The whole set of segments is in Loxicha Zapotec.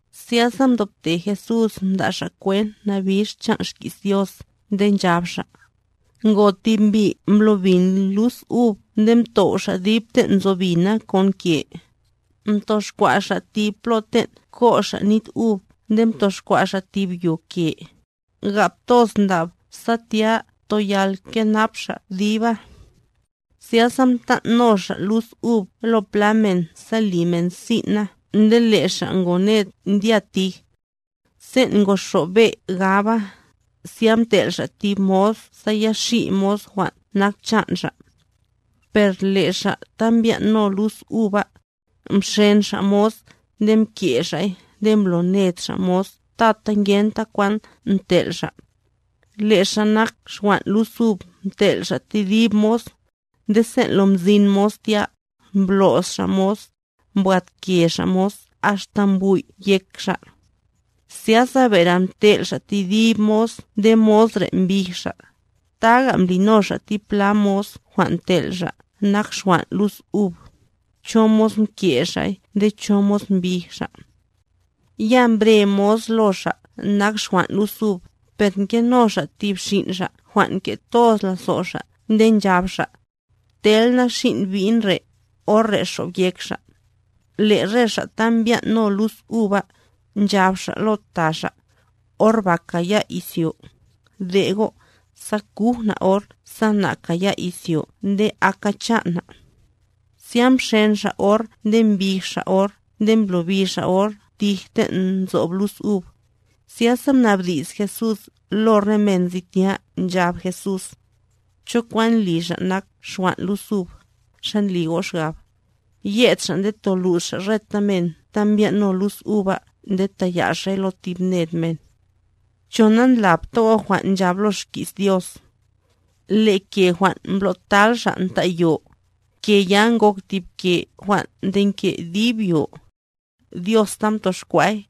Zyasa mdobte Jesús mda' Xa' kwent nabix chan' xki's Dios nde nchab Xa': —Ngo tib mbi' mblo bin lus ub nde mtow' xa' dib ten' nzo bina kon ke, mtoxkwa' xa' tib plo ten' ko' xa' nit ub nde mtoxkwa' xa' tib yo ke, gap toz ndab sa tya toyal kenap xa' diba. ’Zyasa mtan' no xa' lus ub lo pla men sa li men sin' na nde le' xa' ngo ned ndya tij. Sen' ngoxob be' gaba, zya mtel' xa' tib mos sa ya xi' mos jwan' nak chan' xa'. Per le' re xa' ta mbyan' no lus ub ba, mxen xa' mos nde mke' xa'y nde mbloned xa' mos tata ngenta kwan ntel' xa'. Le' xa' nak xwan' lus ub mtel' xa' tedib mos; nde sen' lo mzin mos tya, mblo's xa' mos, mbwadke xa' mos axta mbwi'y yek mos. Zyasa bere mtel' xa' tedib mos nde mos re' mbij xa'; taga mblino xa' tipla mos jwan' mtel' xa' nak xwan' lus ub, cho mos mke xa'y nde cho mos mbij xa'. ’Ya mbre mos lo xa' nak xwan' lus ub, per ngeno xa' tib xin' xa' jwan' nke toz lazo' xa' nde nchab xa': “Tel na xin' bi'n re', or re' xob yek xa'.” Le' re xa' ta mbyan' no lus ub ba, nchab xa' lo ta xa': “Or ba kaya' izyo. De' go', sa kuj na' or sa na' kaya' izyo nde aka chan' na'.” Zya mxen xa' or nde mbij xa' or nde mblobi xa' or tij ten' nzob lus ub. Zyasa mnabdi's Jesús lo re men nzi tya nchab Jesús: —¿Cho kwan li xa' nak xwan' lus ub, xa ndli go' xgab? Yed xa' nde tolux xa' reta men ta mbyan' no lus ub ba nde taya' xa'y lo tib ned men. ’¿Cho nandlapta go' jwan' nchab lo xki's Dios? Le' ke jwan' mblotal xa' nta' yo, ke ya ngok tib ke jwan' ndenke' dib yo. Dios ta mtoxkwa'y;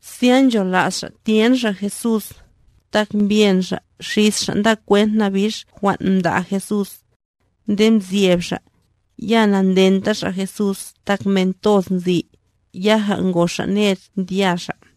Zya nchola's xa' tyen xa' Jesús, tak mbyen xa' xis xa' nda kwent nabix jwan' mda' Jesús. Nde mzyeb xa', ya nandenta xa' Jesús tak men toz nzi, yaja ngo xa' ned ndya xa'.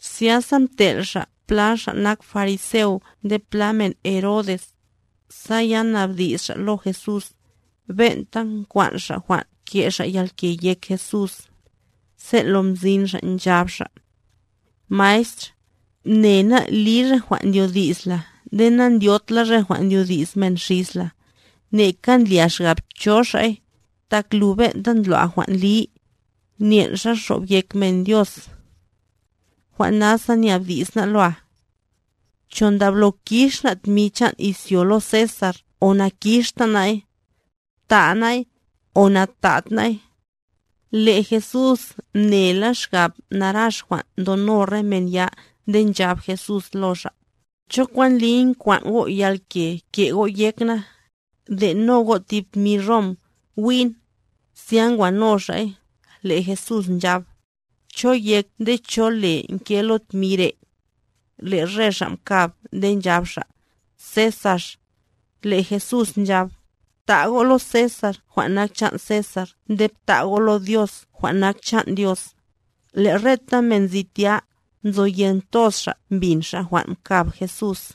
Zyasa mtel' xa' pla xa' nak fariseo nde pla men Herodes, sa ya nabdi's xa' lo Jesús, ben'ta nkwan' xa' jwan' ke' xa' yalke yek Jesús. Sen' lo mzin xa' nchab xa': —Maestr, mne ná' li re jwan' ndyodi's la nde nandyod la re jwan' ndyodi's men xis la, neka ndlia xgab cho xa'y, tak lu ben'ta ndlo' jwan' li, nyen' xa xob yek men Dios. Jwan' nasa nyabdi's ná' loa: “¿Cho ndablo kix na' tmi chan' izyo lo Cesarb o nakixta na'y? ¿Ta' na'y, o natad na'y?” Le' Jesús mnela xgab narax jwan' ndono re men ya nde nchab Jesús lo xa': —¿Cho kwan ndliy nkwan' go' yalke ke' go' yek na? De'no go' tib tmi Rom, wi'n. Zya ngwano xa'y, le' Jesús nchab: —¿Cho yek nde cho le nke lo tmi re'? Le' re xa' mkab nde nchab xa': —Cesar. Le' Jesús nchab: —Bta' go' lo Cesar jwan' nak chan' Cesar nde bta' go' lo Dios jwan' nak chan' Dios. Le' reta men nzi tya, nzoyen toz xa' mbin xa' jwan' mkab Jesús.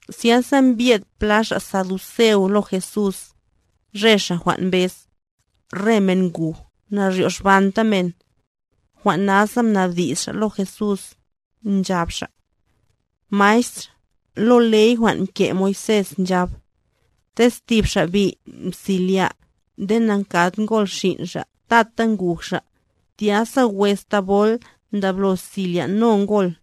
Zyasa mbye'd pla xa' saduceos lo Jesús, re xa' jwan' mbez: “Re men nguj naryoxbanta men.” Jwan' nasa mnabdi's xa' lo Jesús, nchab xa': —Maestr, lo ley jwan' mke' Moisés nchab: “Tez tib xa' bi' mselya', nde na'nkad ngol xin' xa' tata nguj xa', tya sa wes thabol ndablo selya'no ngol,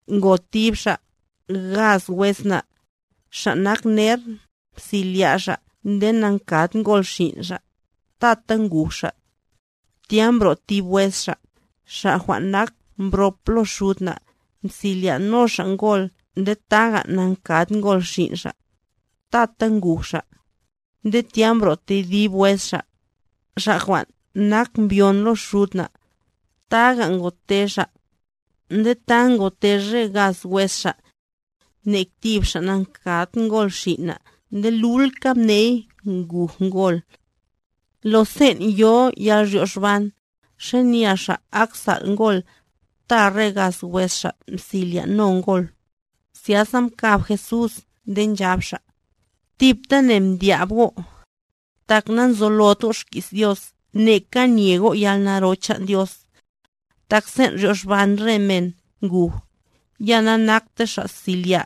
Ngo tib xa', gaz wes na'. Xa' nak ner, mselya' xa' nde na'nkad ngol xin' xa', tata nguj xa'. Tya mbro' tib wes xa', xa' jwan' nak mbrop lo xud na', mselya'no xa' ngol nde taga na'nkad ngol xin' xa', tata nguj xa'. Nde tya mbro' tedib wes xa', xa' jwan' nak mbyon lo xud na', taga ngote xa'. Nde ta ngote re gaz wes xa'. Nek tib xa' namkad ngol xin' na' nde lulka mney nguj ngol. ¿Lo sen' yo yalryoxban, xanya xa' ak sal' ngol, ta re gaz wes xa' mselya'no ngol? Zyasa mkab Jesús nde nchab Xa': —¡Tiptane mdyab go'! Tak nanzolot go' xki's Dios neka nye go' yalnaro chan' Dios. Tak sen' ryoxban re men nguj, ya nakta xa' selya'.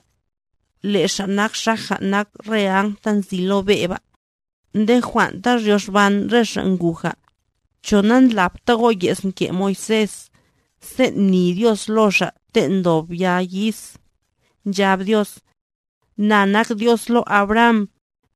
Le' xa' ak xaja nak re Áng ta nzi lo be' ba. Nde jwan' ta ryoxban re xa' nguja, ¿Cho nandlapta go' ye's mke' Moisés, sen' mni Dios lo xa' ten' ndob ya yis, nchab Dios: “Na nak Dios lo Abraham,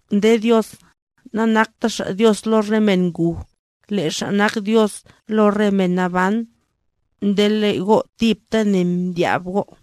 Nde Dios, nanakta Xa' Dios lo re men nguj, le' Xa' nak Dios lo re men naban. Nde le' go' tiptane mdyab go'.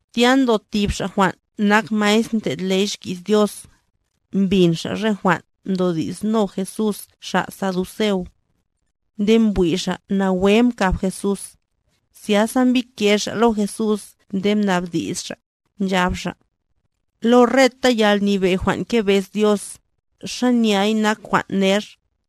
Tya ndo tib xa' jwan' nak maestr ndlo' ley xki's Dios, mbin xa' re jwan' mdodi'sno Jesús xa' saduceo. Nde mbwi' xa' nawe mkab Jesús, zyasa mbike xa' lo Jesús nde mnabdi's xa', nchab xa': —¿Lo reta yalnyebe' jwan' ngebez Dios, xanyay nak jwan' ner?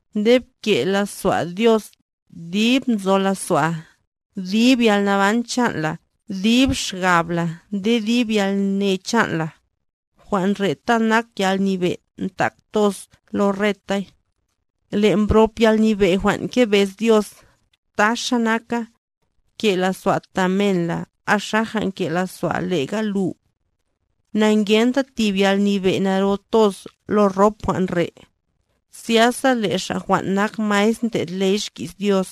Nde bke' lazo'a Dios, dib nzo lazo'a, dib yalnaban chan' la, dib xgab la nde dib yalne chan' la.”e Jwan' re'ta nak yalnyebe' ndak toz lo retay. Le' mbrop yalnyebe' jwan' ngebez Dios, taxa naka: “Bke' lazo'a ta men la axaja nke' lazo'a lega lu.”f Na'ngenta tib yalnyebe' naro toz lo rop jwan' re'. Zyasa le' xa' jwan' nak maestr ndlo' ley xki's Dios,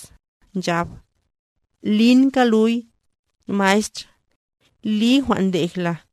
nchab: —¡Linka luy, maestr! ¡Li jwan' ndej la!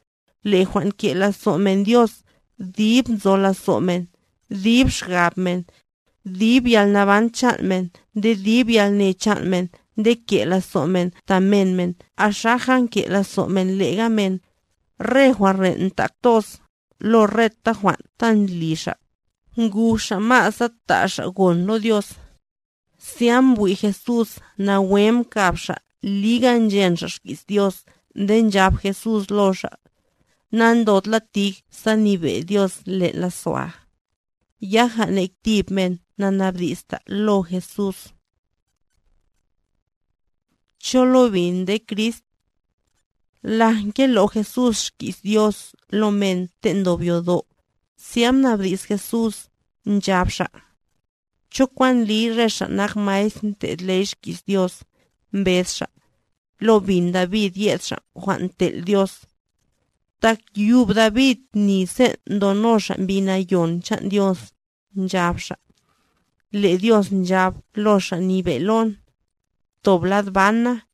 Le' jwan' ke' lazo' men Dios, dib nzo lazo' men, dib xgab men, dib yalnaban chan' men nde dib yalne chan' men nde ke' lazo' men ta men xaja nke lazo' men lega men, re jwan' re' ndak toz, lo reta jwan' ta ndli xa', nguj xa' ma' sa ta' xa' gon lo Dios. Zya mbwi' Jesús nawe mkab xa' liga nchen xa' xki's Dios nde nchab Jesús lo xa': —Nandod la tij sa nyebe' Dios len' lazo'a. Yaja nek tib men na'nabdi'sta lo Jesús. ¿Cho lo bin nde Crist? Laj ngelo' Jesús xki's Dios lo men ten' ndob yodo', zya mnabdi's Jesús, nchab Xa': —¿Cho kwan ndliy re xa' nak maestr ndlo' ley xki's Dios, mbez xa': “Lo bin David yed Xa' jwan' tel' Dios”? Tak yub David mni sen' ndono xa' Mbi Nayon chan' Dios, nchab xa': Le' Diosh nchab lo Xa' Nyebe' lon: “Ptob lad ban na,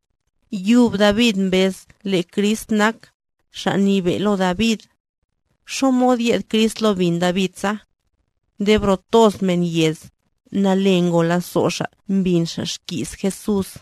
Yub David mbez le' Crist nak “Xa' Nyebe' lo David”. ¿Xamod yed Crist lo bin David sa? Nde bro toz men nzo yez, nale ngo lazo' xa' mbin xa' xki's Jesús.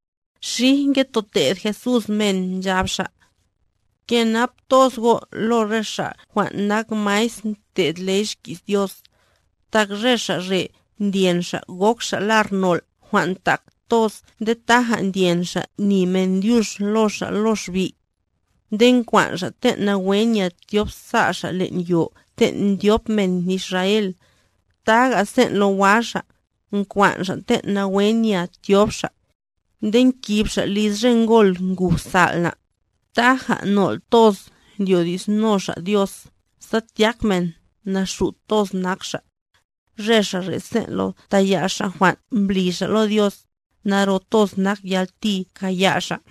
Xij ngetoted Jesús men, nchab Xa': —Kenap toz go' lo re xa' jwan' nak maestr ndlo' ley xki's Dios, tak re xa' re' ndyen xa' gok xa' lar nol' jwan' ntak toz nde taja ndyen xa' ni men dyux lo xa' lo xbi'. Nde nkwan' xa' ten' nawe nya tyobza' xa' len' yo ten' ndyop men Israel, taga sen' lo wa xa', nkwan' xa' ten' nawe nya tyob xa'. Nde nkib xa' liz re ngol nguj sal' na', taja nol' toz ndyodi'sno xa' Dios sa tyák men naxut toz nak xa'. Re xa' re' sen' lo taya' xa' jwan' mbli xa' lo Dios, naro toz nak yalti kaya' xa'.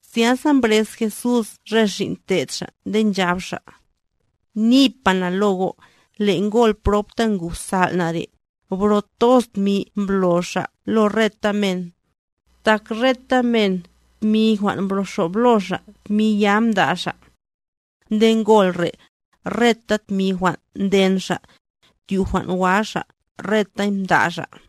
Zyasa mbrez Jesús re xin' te'd Xa' nde nchab Xa': —Nipa na lo go', le' ngol prob ta nguj sal' na' re', bro toz tmi mblo xa' lo reta men. Tak reta men, tmi jwan' mbroxob lo xa' tmi ya mda' xa'. Nde ngol re', reta tmi jwan' nden xa', tyu' jwan' wa xa', retay mda' xa'.